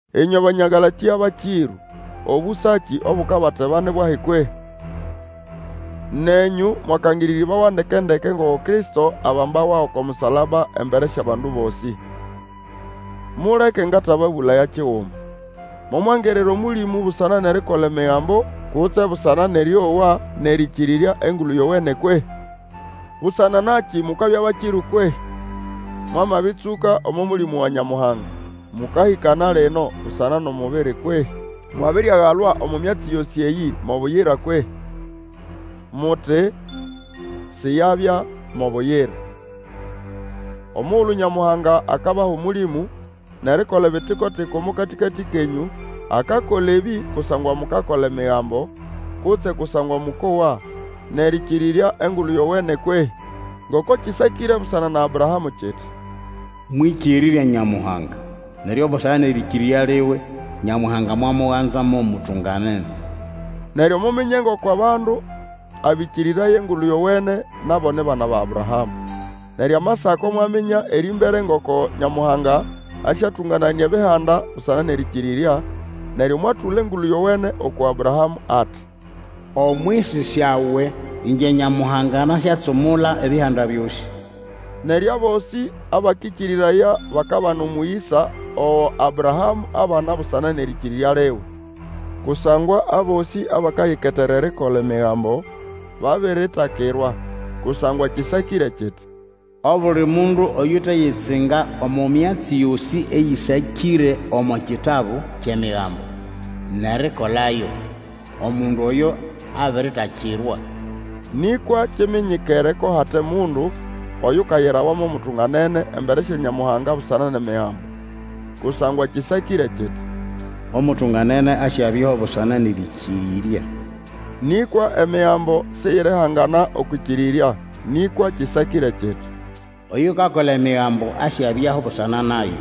Ĩnywe Banya Galatĩa bakĩrũ, obusaki obukabateba ni bwahi kwehĩ? Nenyũ mwakangĩrĩrĩbawa ndeke-ndeke ngoko Kristo abambawa oko musalaba embere syʼabandu bosĩ. Muleke ngatababũlaya kiguma, momwangirira Omũlĩmũ busana nʼerikola Emigambo, kutse busana nʼerĩowa nʼerĩkĩrĩrya Engulu Yowene kwehĩ? Busana nakĩ mukabya bakĩrũ kwehĩ? Mwamabĩtsũka omo Mũlĩmũ wa Nyamuhanga, mũkahĩkana lino busana nʼomubiri kwehĩ? Mwabiriagalwa omo myatsi yosĩ eyĩ mo buyira kwehĩ? Muti, siyabya mo buyira! Omugulu Nyamuhanga akabaha Omũlĩmũ, nʼerikola ebitiko-tiko omo katĩkatĩ kenyũ, akakola ebĩ kusangwa mukakola Emigambo, kutse kusangwa mũkowa nʼerĩkĩrĩrya Engulu Yowene kwehĩ? Ngoko kĩsakĩre busana na Abrahamũ kiti, Mwĩkĩrĩrya Nyamuhanga, neryo busana nʼerĩkĩrĩrya liwe, Nyamuhanga mwamuganza mo mutunganene. Neryo, muminye ngoko abandu ababĩrĩkĩrĩrya Engulu Yowene, nabo ni bana ba Abrahamũ. Neryo Amasako mwaminya erĩmbere ngoko Nyamuhanga asyatũngananĩa Ebihanda busana nʼerĩkĩrĩrya, neryo mwatũla Engulu Yowene uku Abrahamũ ati, Omwisi syawe, ĩngye Nyamuhanga nasyatsumula Ebihanda byosĩ. Neryo abosĩ abakĩkĩrĩraya bakabana omũyĩsa ogo Abrahamũ abana busana nʼerĩkĩrĩrya liwe. Kusangwa abosĩ abakayiketera erikola Emigambo babiritakirwa; kusangwa kĩsakĩre kiti, Obuli mundu oyuteyitsinga omo myatsi yosĩ eyĩsakĩre omo kitabu kyʼEmigambo, nʼerikolayo, omundu oyo abiritakirwa. Nĩkwa kiminyikere ko hate mundu oyukayirawa mo mutunganene embere sya Nyamuhanga busana nʼEmigambo, Kusangwa kĩsakĩre kiti, Omutunganene asyabyaho busana nʼerĩkĩrĩrya. Nĩkwa Emigambo siyirihangana okwʼĩkĩrĩrya, nĩkwa kĩsakĩre kiti, Oyukakola Emigambo asyabyaho busana nayo.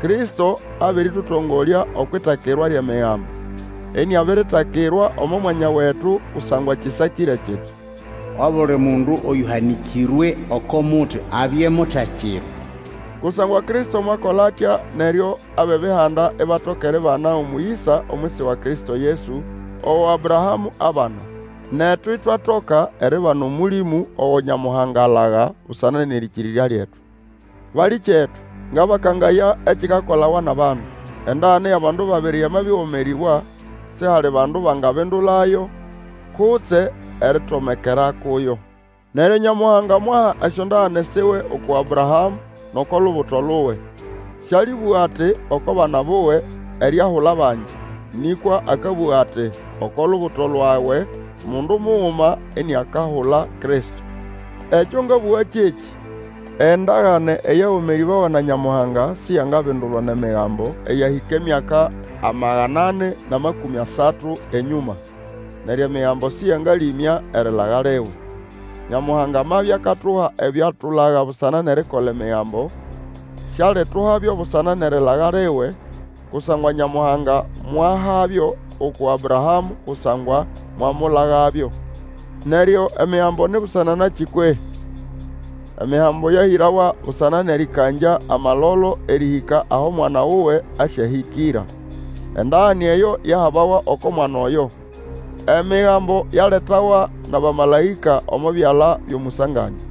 Kristo abĩrĩtũtongolya okwʼitakirwa lyʼEmigambo, iniabiritakirwa omo mwanya wetu, kusangwa kĩsakĩre kiti, Obuli mundu oyũhanĩkĩrwe oko muti abye mutakirwa. Kusangwa Kristo mwakola atya neryo abʼEbihanda ibatoka eribana omũyĩsa omwisi wa Kristo Yesu, ogo Abrahamũ abana. Netu itwatoka eribana Omũlĩmũ ogo Nyamuhanga alaga busana nʼerĩkĩrĩrya lyetu. Balĩkyetu, ngabakangaya ekikakolawa nʼabandu. Endagane yʼabandu babiri yamabĩgomerĩbwa, sihali bandu bangabindulayo kutse eritomekera kuyo. Neryo. Nyamuhanga mwaha esyondagane siwe uku Abrahamũ nʼoko lubuto luwe. Sĩalĩbũga ati, oko bana buwe, eriahula bangi, nĩkwa akabũga ati, oko lubuto lwawe mundu muguma, iniakahula Kristo. Ekyo ngabũga kyekĩ, endagane eyagomerĩbawa na Nyamuhanga siyangabindulwa nʼEmigambo eyahĩka emyaka amagana ani nʼamakũmĩ asatu enyũma. Neryo Emigambo sĩyangalĩmya erilaga liwe. Nyamuhanga amabya akatuha ebyo atulaga busana nʼerikola Emĩgambo, sialituhabyo busana nʼerilaga liwe; kusangwa Nyamuhanga mwahabyo uku Abrahamũ kusangwa mwamulagabyo. Neryo Emigambo ni busana nakĩ kwehĩ? Emigambo yahĩrawa busana nʼerĩkangya amalolo erĩhĩka aho mwana wuwe asyahĩkĩra. Endagane eyo yahabawa oko mwana oyo. Emigambo yaletawa nʼabamalaĩka omo byala byʼomũsanganĩa.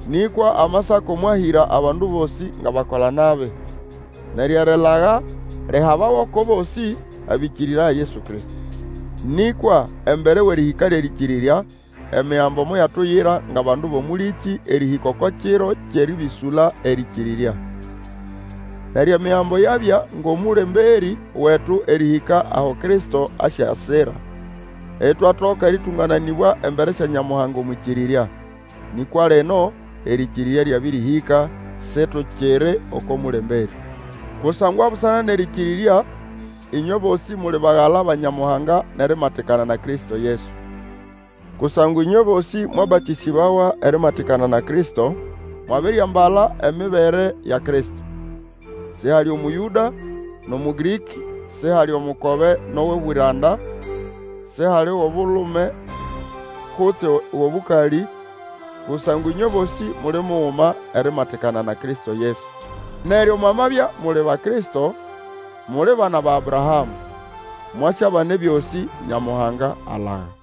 Nĩkwa Amasako mwahĩra abandu bosĩ ngʼabakola-nabi, neryo erilaga lihabawe oko bosĩ abakĩkĩrĩraya Yesu Kristo. Nĩkwa embere wʼerĩhĩka lyʼerĩkĩrĩrya, Emigambo moyatuyira ngʼabandu bʼomũlĩkĩ erĩhĩka oko kiro kyʼerĩbĩsũla erĩkĩrĩrya. Neryo Emigambo yabya ngʼomũlemberĩ wetu erĩhĩka aho Kristo asyasira, itwatoka erĩtũngananĩbwa embere sya Nyamũhanga omwʼĩkĩrĩrya. Nĩkwa lino erĩkĩrĩrya lyabĩrĩhĩka, situkiri oko mũlemberĩ. Kusangwa busana nʼerĩkĩrĩrya, ĩnywe bosĩ muli bagala ba Nyamuhanga nʼerimatikana na Kristo Yesu. Kusangwa ĩnywe bosĩ mwabatĩsĩbawa erimatikana na Kristo mwabiriambala emibere ya Kristo. Sihali Omũyũda nʼOmũgĩrĩkĩ, sihali omukoba nʼogʼobwĩranda, sihali wʼobulume kutse wʼobũkalĩ; kusangwa ĩnywe bosĩ muli muguma erimatikana na Kristo Yesu. Neryo mwamabya muli Bakristo, muli bana ba Abrahamũ, mwasyabana ebyosĩ Nyamuhanga alaga.